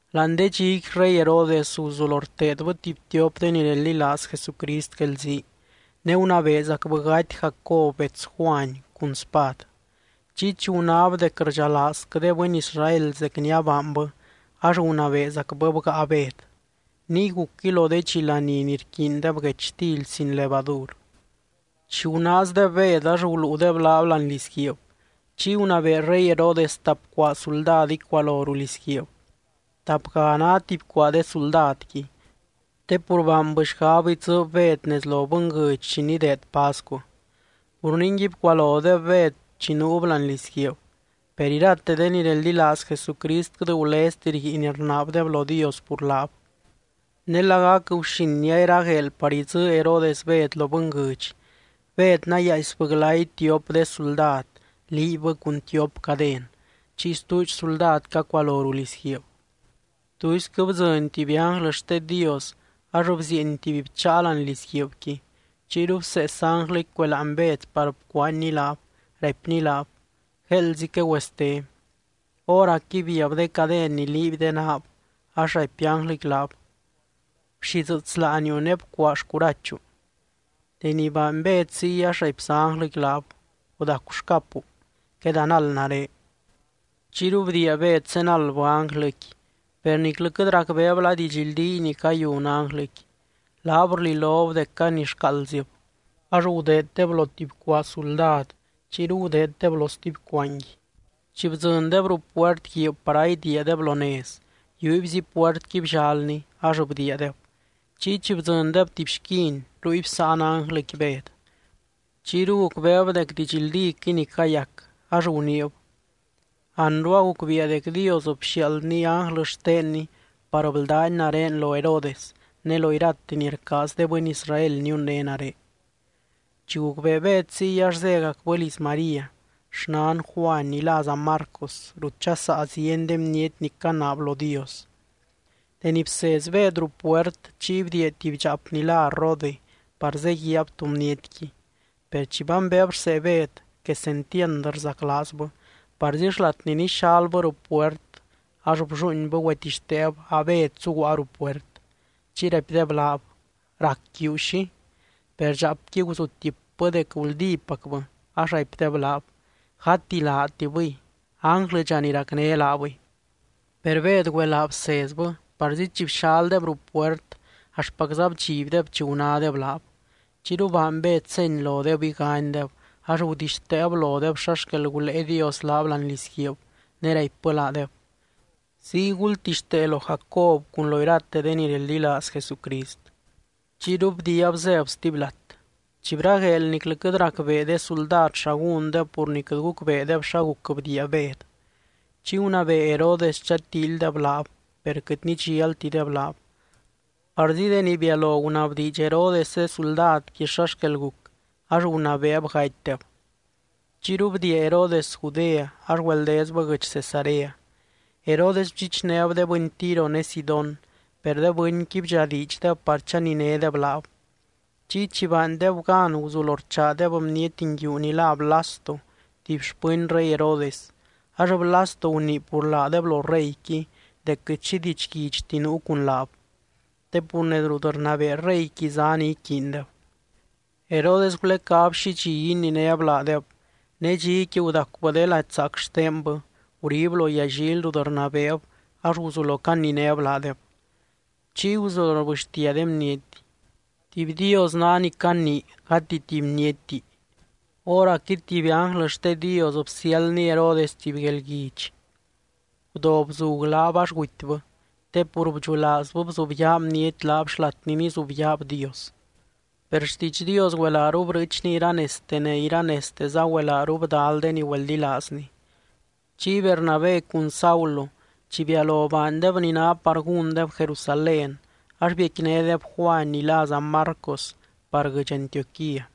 Láani de dxiqui rey Herodes guzulo rteedbɨ tuby tiop de ni reldilaaz Jesucrist guelzii. Ne gunabeezacbɨ gaty Jacob bets Juany cun spad. Chiy chi gunáb dec rdxalaazquɨ de bɨny Israel zec ni abaanbɨ, ax gunabeezacbɨ bgáa Bed. Niy gucquɨy lo de dxi laní ni rquiindeb guechtily sin levadur. Chi gunaazdeb Bed ax guluudeb laab láani lizguiib. Chiy gunabee rey Herodes tap cuaa suldad icualo ruu lizguiib. Tapga ná tuby cuaa de suldadqui. Te pur baanbɨ xgab idzɨɨb Bed nez lo bɨnguɨdx chi nideed pascu. Pur ningui bcualodeb Bed chi nuub láani lizguiib. Per irate de ni reldilaaz Jesucrist quɨt gulezti rguiin rnaabdeb lo Dios pur laab. Ne lagac guxin ni a iragueel par idzɨɨ Herodes Bed lo bɨnguɨdx, Bed nayaaisbɨ glay tiop de suldad liibbɨ cun tiop caden, chiy stuudx suldad cacualo ruu lizguiib. Tuisquɨ bdzɨny tuby ánglɨ xte Dios ax bzieeny tuby bcháa láani lizguiibqui. Chiyru bsees ánglɨqui cueláany Bed par bcuanyny laab, raipny laab: —Gueeldzi quegüeste. Hóracqui biab de caden ni liiby de naab, ax raipy ánglɨqui laab: —Bxidzɨɨts láaniu ne bcuaa xcurachu. Deni baany Bed ziy ax raipza ánglɨqui laab: —Gudacu xcapu. Quedanald nare. Chiyru bdiia Bed zenaldbɨ ánglɨqui, per niclɨ quɨt racbeeb la didxldíy ni cayun ánglɨqui. Laab rlilob dec canixcaaldzib. Ax gudeeddeb lo tuby cuaa suldad, chiyru gudeeddeb lo stuby cuaangui. Chi bdzɨndeb ruu puert guiib par a idiiadeb lo nez, yiubyzi puertqui bllalni, ax bdiiadeb. Chiy chi bdzɨndeb tuby xquin, ruy bsáan ánglɨqui Bed. Chiyru gucbeeb dec didxldíquɨy ni cayac, ax guniib: —Anru agucbiia dec Dios bxiaaldny ánglɨ xtenny par bldány nare lo Herodes ne lo irate ni rcaaz de bɨny Israel niunné nare. Chi gucbee Bed ziy ax zégacbɨ liz María, xnan Juany, ni láza Marcos, rut dxasaa zieny de bniety ni canaab lo Dios. Deni bsez Bed ruu puert, chiy bdiia tuby dxaap ni lá Rode par zeguiaab tú bnietqui. Per chi bambeeb rsee Bed, quesentiand rzaclaazbɨ, parzi xlat ni nixalbɨ ruu puert ax blluuinbɨ güetixteeb a Bed zuguaa ruu puert. Chiy raipdeb laab: —¡Rac quiu xi! Per dxaapqui guzutipbɨ dec guldípacbɨ. Ax raipdeb laab: —Gati laatibɨy, ánglɨdxa ni racné laabɨy. Per Bed güelaa bsezbɨ, parzi chi bxaldeb ruu puert axtpacza bdxibdeb chi gunádeb laab. Chiyru baany Bed seny lodeb iganydeb, ax gudixteeb lodeb xa xquel gulée Dios laab láani lizguiib. Ne raipbɨ laadeb: —Ziy gultixtee lo Jacob cun lo irate de ni reldilaaz Jesucrist. Chiyru bdiiab zéb stuby lat. Chi bragueel niclɨ quɨt racbee de suldad xa gúndeb pur ni quɨt gucbeedeb xa guc bdiia Bed. Chiy gunabee Herodes chatíilydeb laab, per quɨt nidxialtideb laab. Parzi deni bialo gunabdiidx Herodes de suldadqui xa xquel guc, ax gunabeeb gatydeb. Chiyru bdiia Herodes Judea ax güeldezbɨ guɨdx Cesarea. Herodes bdxichnéb de bɨny Tiro ne Sidón. Per de bɨnqui bdxadiidxdeb par chaninédeb laab. Chiy chi baandeb gan guzulo rchaadeb bniety nguiu ni lá Blasto tuby xpɨny rey Herodes, ax Blasto gunii pur laadeb lo reyqui dec quɨt xi didxguidxti nuu cun laab. Te pur nez rut rnabee reyqui zá ni rquiindeb. Herodes gulecáb xi dxi ininéb laadeb. Ne dxiqui gudacubɨ de lady zaac xtenbɨ, gurib lo yallily rut rnabeeb, ax guzulo caninéb laadeb. Chiy guzulo rbɨxtia de bniety: —¡Tuby dios ná ni canii gati tuby bnietti! Hóracqui tuby ánglɨ xte Dios bsiáldny Herodes tuby guelguidx. Gudo bzug laab ax gutybɨ, te pur bdxulaazbɨ bzubyaa bniety laab xlat ni nizubyaab Dios. Per xtiidx Dios güelaaru brɨɨchni iranezte ne iranezteza güelaaru bdal de ni güeldilaazny. Chiy Bernabé cun Saulo chi bialo baandeb ni ná par gúndeb Jerusalén, ax biecquinédeb Juany ni láza Marcos par guɨdx Antioquía.